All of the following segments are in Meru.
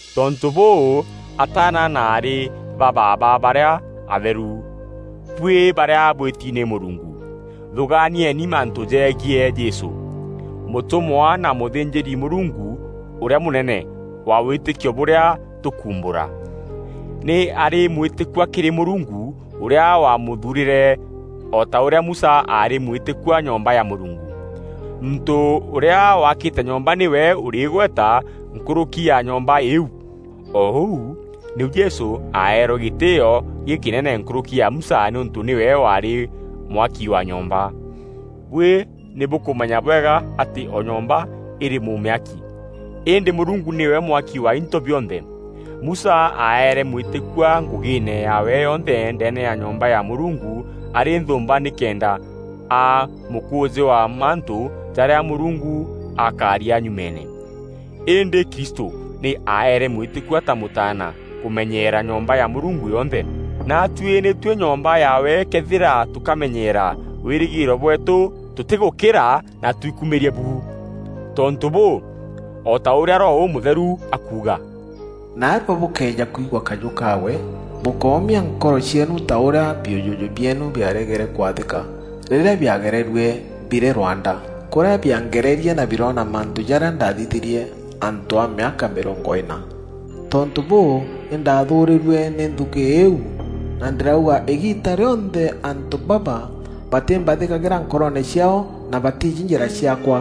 Tontû bûû, ataana na aarî ba baaba barîa atheru, buî barîa bwîti nî Mûrungu, thûgaanieni mantû jegiî Jesû, mûtûmwa na mûthînjîri-Mûrungu ûrîa mûnene wa wîtîkio bûrîa tûkuumbûra. Nî aarî mwîtîkua kîrî Mûrungu ûrîa waamûthuurîre, o ta ûrîa Musa aarî mwîtîkua nyomba ya Mûrungu. Muntû ûrîa wakîte nyomba nîwe ûrî îgweta nkûrûki ya nyomba îîu. O ûu nîu Jesû aeerwe gîtîîo gîkînene nkûrûki ya Musa nîûntû nîwe waarî mwaki wa nyomba. Buî nî bûkûmenya bwega atî o nyomba îrî mûmîaki, îndî Mûrungu nîwe mwaki wa into bionthe. Musa aeere mwîtîkua ngûgîîne yaawe yonthe ndeene ya nyomba ya Mûrungu arî nthûûmba nîkenda aa mûkûûjî wa mantû jarîa Mûrungu akaaria nyumeene. Îndî Kristû nî aeere mwîtîkua ta Mûtaana kûmenyeera nyomba ya Mûrungu yonthe. Naatuî nî tuî nyomba yaawe këethîra tûkamenyeera wîrîgîîro bweetû tûtîgûkîra na twikumîrie bu. Tontû bûû, o ta ûrîa Roho Ûmûtheru akuuga, “Naarua, bûkëeja kwigua kajû kaawe, bûkómia nkoro cieenu ta ûrîa biûjûjû bieenu biaregere kwathîka rîrîa biagererue birî rwanda, kûrîa biangererie na biroona mantû jarîa ndaathithîrie antû a mîaka mîrongo îna. Tontû bûû, nî ndaathûûrîrue nî nthûûkî îîu, na ndîrauga ‘Îgiita rîonthe antû baba batîmbathîkagîra nkoroone ciaao, na batiijî njîra ciaakwa.’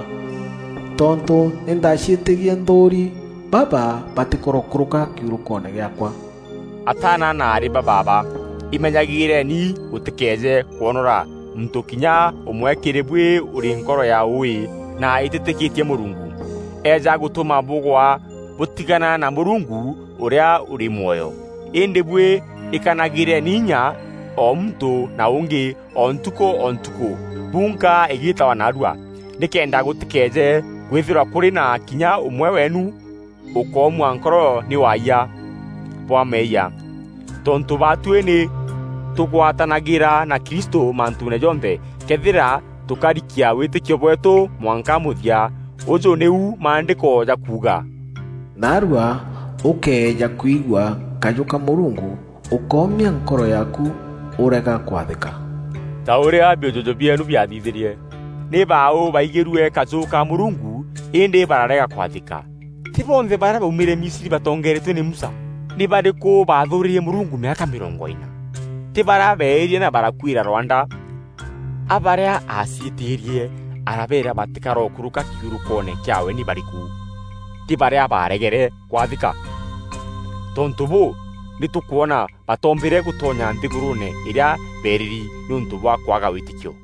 Tontû nî ndaaciîtîrie nthûûri, ‘Baba batîkorokûrûka kiurûkoone gîaakwa.’” Ataana na aarî ba baaba, imenyagîîreni gûtîkeeje kwonora muntû kinya ûmwe kîrî buî ûrî nkoro ya ûûî na îtîîtîkîtie Mûrungu, eeja gûtûma bûgwa bûtigana na Mûrungu ûrîa ûrî mwoyo. Îndî buî, îkanagîreni inya o muntû na ûngî o ntukû o ntukû, bunka îgîtagwa “Naarua,” nîkenda gûtîkeeje kwîthîrwa kûrî na kinya ûmwe weenu ûkoomua nkoro nî waayia bwa meeyia. Tontû baatuî nî tûgwatanagîra na Kristû mantûûne jonthe, këethîra tûkarikia wîtîkio bweetû mwanka mûthia. Ûjû nîu Maandîko jakuuga: “Naarua, ûkëeja kwigua kajû ka Mûrungu, ûkómia nkoro yaaku ûrega kwathîka.” Ta ûrîa biûjûjû bieenu biathithîrie Nî baaû baaigîrue kajû ka Mûrungu îndî bararega kwathîka? Tî bonthe barîa baaumîre Misri batongeeretue nî Musa? Nî barîkû baathûûrîrie Mûrungu mîaka mîrongo îna? Tî barîa beeîrie na barakuîra rwanda? A barîa aaciîtîîrie arabeera batîkorokûrûka kiurûkoone kîaawe nî barîkû? Tî barîa baaregere kwathîka? Tontû bûû, nî tûkwona batoombîre gûtonya nthîgûrûûne îrîa beerîri nîûntû bwa kwaga wîtîkio.